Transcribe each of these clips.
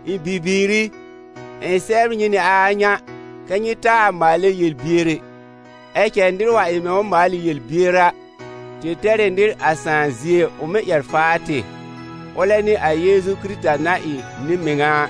Ɩ̃ bibiir i, ɩ̃ sɛbr nyɩ nɩ a a ŋa kɛ́ nyɩ taa maalɛ yel-bier ɛ, ɛ cɛ nɩr wa ɩ mɛ̃ ʋ maal ɩ yel-bier a, tɩ tɛr ɩ nɩr a Sãà zie ʋ mɩ́ ƴɛr faa tɩ, ʋlɛ n'ɩ a Yeezu Kɩrɩta na ɩ nɩ-mɩŋa a.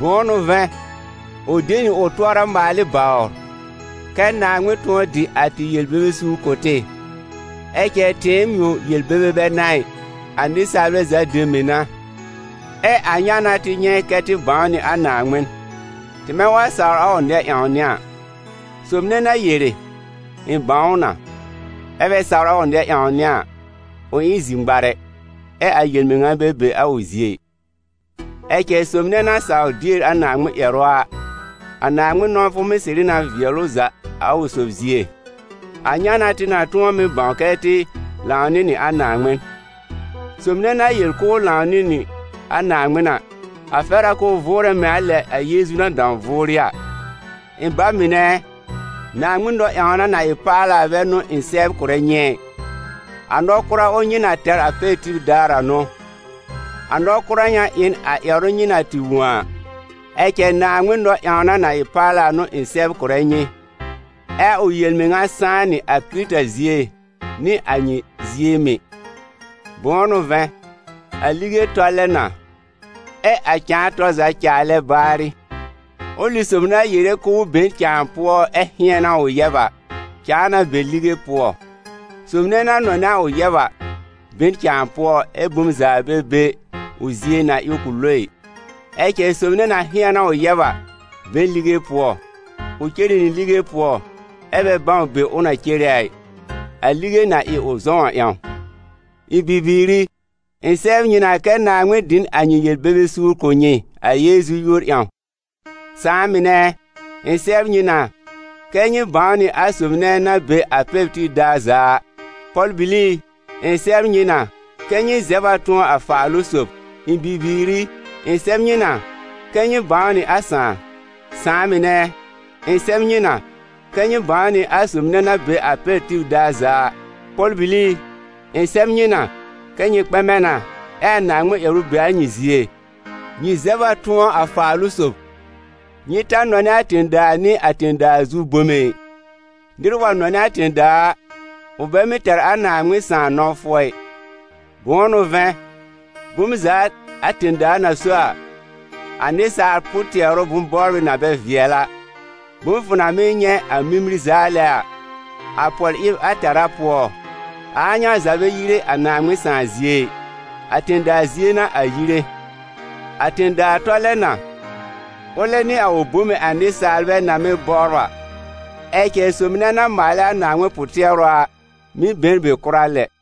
Bʋ̃ʋ n'ʋ vɛ̃, ʋ de nɩ ʋ tʋɔra maal ɩ bawr, kɛ́ Naaŋmɩn tʋ̃ɔ dɩ a tɩ yel-bebe suur kʋ̀ tɩ. Ɛ cɛ tɩɩm yõ yel-bebe bɛ n'a ɩ, a nɩsaalbɛ za dem mɩ̀ n'a. Ɛ a ŋa n'a tɩ nyɛ̃ kɛ́ tɩ bãw nɩ a Naaŋmɩn: tɩmɛ wa sawr a ʋ nɛ-ƴãwnɩ a. Sob nɛ na yere: «Ɩ̃ bãw ʋ na», ɛ bɛ sawr a ʋ nɛ-ƴãwnɩ a, ʋ ɩ n zir-ŋmarɛ, ɛ a yel-mɩŋa bɛ be a ʋ zie ɩ. Ɛ cɛ sob nɛ na sawr dier a Naaŋmɩn ƴɛrʋ a, a Naaŋmɩn nɔ̃wfʋ mɩ́ sɩrɩ na vɩɛl ʋ za a ʋ sob zie. A ŋa n'a tɩ na tʋ̃ɔ mɩ́ bãw kɛ tɩ lãw nɩ nɩ a Naaŋmɩn. Sob nɛ na yel k'ʋʋ lãw nɩ nɩ a Naaŋmɩn a, a fɛr a k'ʋʋ vʋʋrɛ mɛ̃ a lɛ a Yeezu na dãw vʋʋrɩ a. Ɩ̃ ba mɩnɛ ɛ, Naaŋmɩn nɔ-ƴãwna na ɩ paala a bɛ n'ʋ ɩ̃ sɛbr kʋ̀rɛ nyɩ ɛ, a nɔ-kʋra ʋl nyɩ na tɛr a pɛr tib daar a n'ʋ, a nɔ-kʋra ŋa ɩ n a ƴɛrʋ nyɩ na tɩ wõ a. Ɛ cɛ Naaŋmɩn nɔ-ƴãwna na ɩ paala n'ʋ ɩ̃ sɛbr kʋ̀rɛ nyɩ, ɛ a ʋ yel-mɩŋa sãá nɩ a Kɩrɩta zie nɩ a nyɩ zie mɩ̀. Bʋ̃ʋ n'ʋ vɛ̃, a lige tɔlɛ na, ɛ a cãa tɔr za caalɛ baarɩ. Ʋlɩ sob na yere k'ʋʋ be n cãa pʋɔ ɛ hɩ̃ɛn a ʋ yɛb a, cãa na be a lige pʋɔ. Sob nɛ na nɔnɛ a ʋ yɛb a, be n cãa pʋɔ ɛ bom za bɛ be a ʋ zie na ɩ k'ʋ lo ɩ. Ɛ cɛ sob nɛ na hɩ̃ɛn a ʋ yɛb a, be n lige pʋɔ; ʋ cere nɩ lige pʋɔ ɛ bɛ bãw be ʋ na cere a ɩ, a lige na ɩ ʋ zɔ̃w a ƴãw. Ɩ̃ bibiir i, ɩ̃ sɛbr nyɩ na kɛ́ Naaŋmɩn dɩ n a nyɩ yel-bebe suur kʋ̀ nyɩ a Yeezu yúor ƴãw. Sãà mɩnɛ ɛ, ɩ̃ sɛbr nyɩ na kɛ́ nyɩ bãw nɩ a sob nɛ na be a pɛr tib daar za a. Pɔl-bili i, ɩ̃ sɛbr nyɩ na kɛ́ nyɩ zɛb a tʋ̃ɔ a Faalʋ-sob. Ɩ̃ bibiir i, ɩ̃ sɛb nyɩ na kɛ́ nyɩ bãw nɩ a Sãà. Sãà mɩnɛ ɛ, ɩ̃ sɛb nyɩ na kɛ́ nyɩ bãw nɩ a sob nɛ na be a pɛr tib daar za a. Pɔl-bili i, ɩ̃ sɛb nyɩ na kɛ́ nyɩ kpɛmɛ na ɛ a Naaŋmɩn ƴɛrʋ be a nyɩ zie, nyɩ zɛb a tʋ̃ɔ a Faalʋ-sob. Nyɩ ta nɔnɛ a tẽ-daa nɩ a tẽ-daa zu bome ɩ, nɩr wa nɔnɛ a tẽ-daa a, ʋ bɛ mɩ́ tɛr a Naaŋmɩn Sãà nɔ̃wfʋ ɛ. Bʋ̃ʋ n'ʋ vɛ̃, bom za a tẽ-daa na so a: a nɩsaal pʋ-tɩɛrʋ bʋ̃-bɔbrɩ na bɛ vɩɛl a, bom fʋ na mɩ́ nyɛ̃ a mimir zaalɛ a, a pɔl-ɩb a tɛ̀rá pʋɔ, a a ŋa za bɛ yire a Naaŋmɩn Sãà zie ɩ, a tẽ-daa zie n'a a yire. A tẽ-daa tɔlɛ na, ʋlɛ nɩ a ʋ bome a nɩsaalbɛ na mɩ́ bɔbr a, ɛ cɛ sob nɛ na maalɛ a Naaŋmɩn pʋ-tɩɛrʋ a, mɩ́ be n be kʋra lɛ.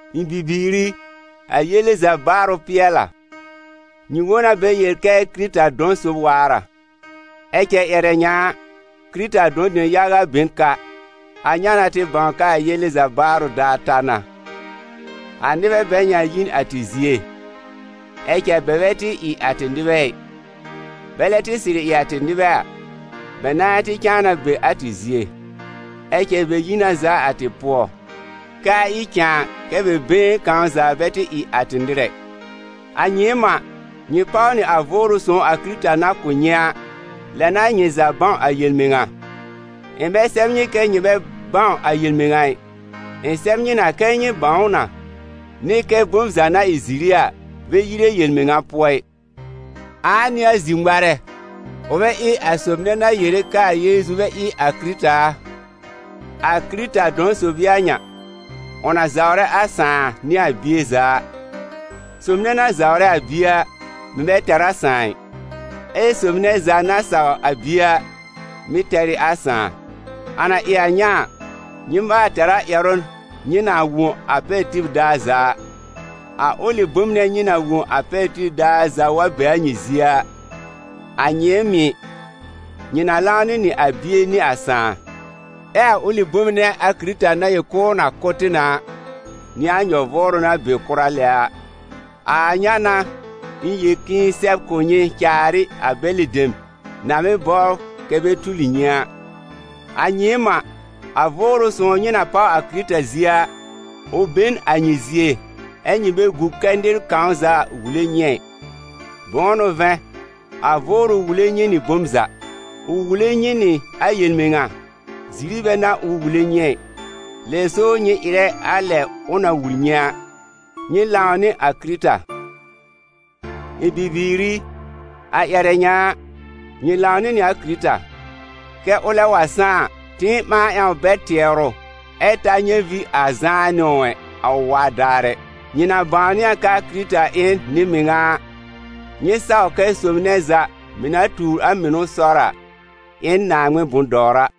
Ɩ̃ bibiir i, a yele za baarʋ pɩɛl a. Nyɩ wõ na bɛ yel kɛ Kɩrɩta dɔ̃ sob waar a. Ɛ cɛ ƴɛrɛ ŋa a, Kɩrɩta dɔ̃-dem yaga be n ka. A ŋa n'a tɩ bãw k'aa yele za baarʋ daar ta na. A nɩbɛ bɛ ŋa yi n a tɩ zie, ɛ cɛ bɛ bɛ tɩ ɩ a tɩ nɩbɛ ɩ. Bɛlɛ tɩ sɩrɩ ɩ a tɩ nɩbɛ a, bɛ nãa tɩ cãa na be a tɩ zie. Ɛ cɛ bɛ yi na zaa a tɩ pʋɔ, k'aa ɩ cãa kɛ́ bɛ been kãw za bɛ tɩ ɩ a tɩ nɩr ɛ. A nyɩɩm a, nyɩ páw nɩ a Vʋʋrʋ Sõw a Kɩrɩta na kʋ̀ nyɩ a, lɛ n'a nyɩ za bãw a yel-mɩŋa. Ɩ̃ bɛ sɛb nyɩ kɛ́ nyɩ bɛ bãw a yel-mɩŋa ɩ, ɩ̃ sɛb nyɩ na kɛ́ nyɩ bãw ʋ na, nɩ kɛ bom za na ɩ ziri a, bɛ yire yel-mɩŋa pʋɔ ɩ. Ãa n'ɩ a zir-ŋmarɛ, ʋ bɛ ɩ a sob nɛ na yere k'aa Yeezu bɛ ɩ a Kɩrɩta a? A Kɩrɩta dɔ̃ sob ɩ a ŋa: ʋ na zawrɛ a Sãà nɩ a Bie za a. Sob nɛ za na zawrɛ a Bie a, mɩ̀ bɛ tɛr a Sãà ɩ. Ɛ sob nɛ za na saw a Bie a, mɩ̀ tɛr ɩ a Sãà. A na ɩ a ŋa a, nyɩ maal tɛr a ƴɛrʋ nyɩ na wõ a pɛr tib daar za a. A ʋlɩ bom nɛ nyɩ na wõ a pɛr tib daar za wa be a nyɩ zie a, a nyɩɩm mɩ̀, nyɩ na lãwnɩ nɩ a Bie nɩ a Sãà. Ɛ a ʋlɩ bom nɛ a Kɩrɩta na yel k'ʋʋ na kʋ̀ tɩ na a, n'ɩ a nyɔ-vʋʋrʋ na be kʋra lɛ a. A a ŋa n'a ɩ̃ yel k'ɩ̃ɩ sɛb kʋ̀ nyɩ caar ɩ a bɛlɩ dem na mɩ́ bɔbr kɛ bɛ tuli nyɩ a. A nyɩɩm a, a Vʋʋrʋ Sõw nyɩ na páw a Kɩrɩta zie a, ʋ be n a nyɩ zie, ɛ́ nyɩ bɛ gu kɛ nɩr kãw za wule nyɩ ɛ. Bʋ̃ʋ n'ʋ vɛ̃, a Vʋʋrʋ wule nyɩ nɩ bom za: ʋ wule nyɩ nɩ a yel-mɩŋa, ziri bɛ n'a ʋ wule nyɩ ɛ, lɛ so nyɩ ɩrɛ a lɛ ʋ na wul nyɩ a: nyɩ lãw nɩ a Kɩrɩta. Ɩ̃ bibiir i, a ƴɛrɛ ŋa a, nyɩ lãwnɩ nɩ a Kɩrɩta, kɛ ʋlɛ wa sãá a, tɩɩm ɓãa ƴãw bɛr tɩɛrʋ, ɛ ta nyɛ̃ vĩ ar zãá nɩ ʋ, a ʋ waa daar ɛ. Nyɩ na bãwnɩ a k'aa Kɩrɩta ɩ n nɩ-mɩŋa a, nyɩ saw kɛ sob nɛ za mɩ̀ na tuur a mɩnʋ sɔr a, ɩ n Naaŋmɩn bʋ̃-dɔwra.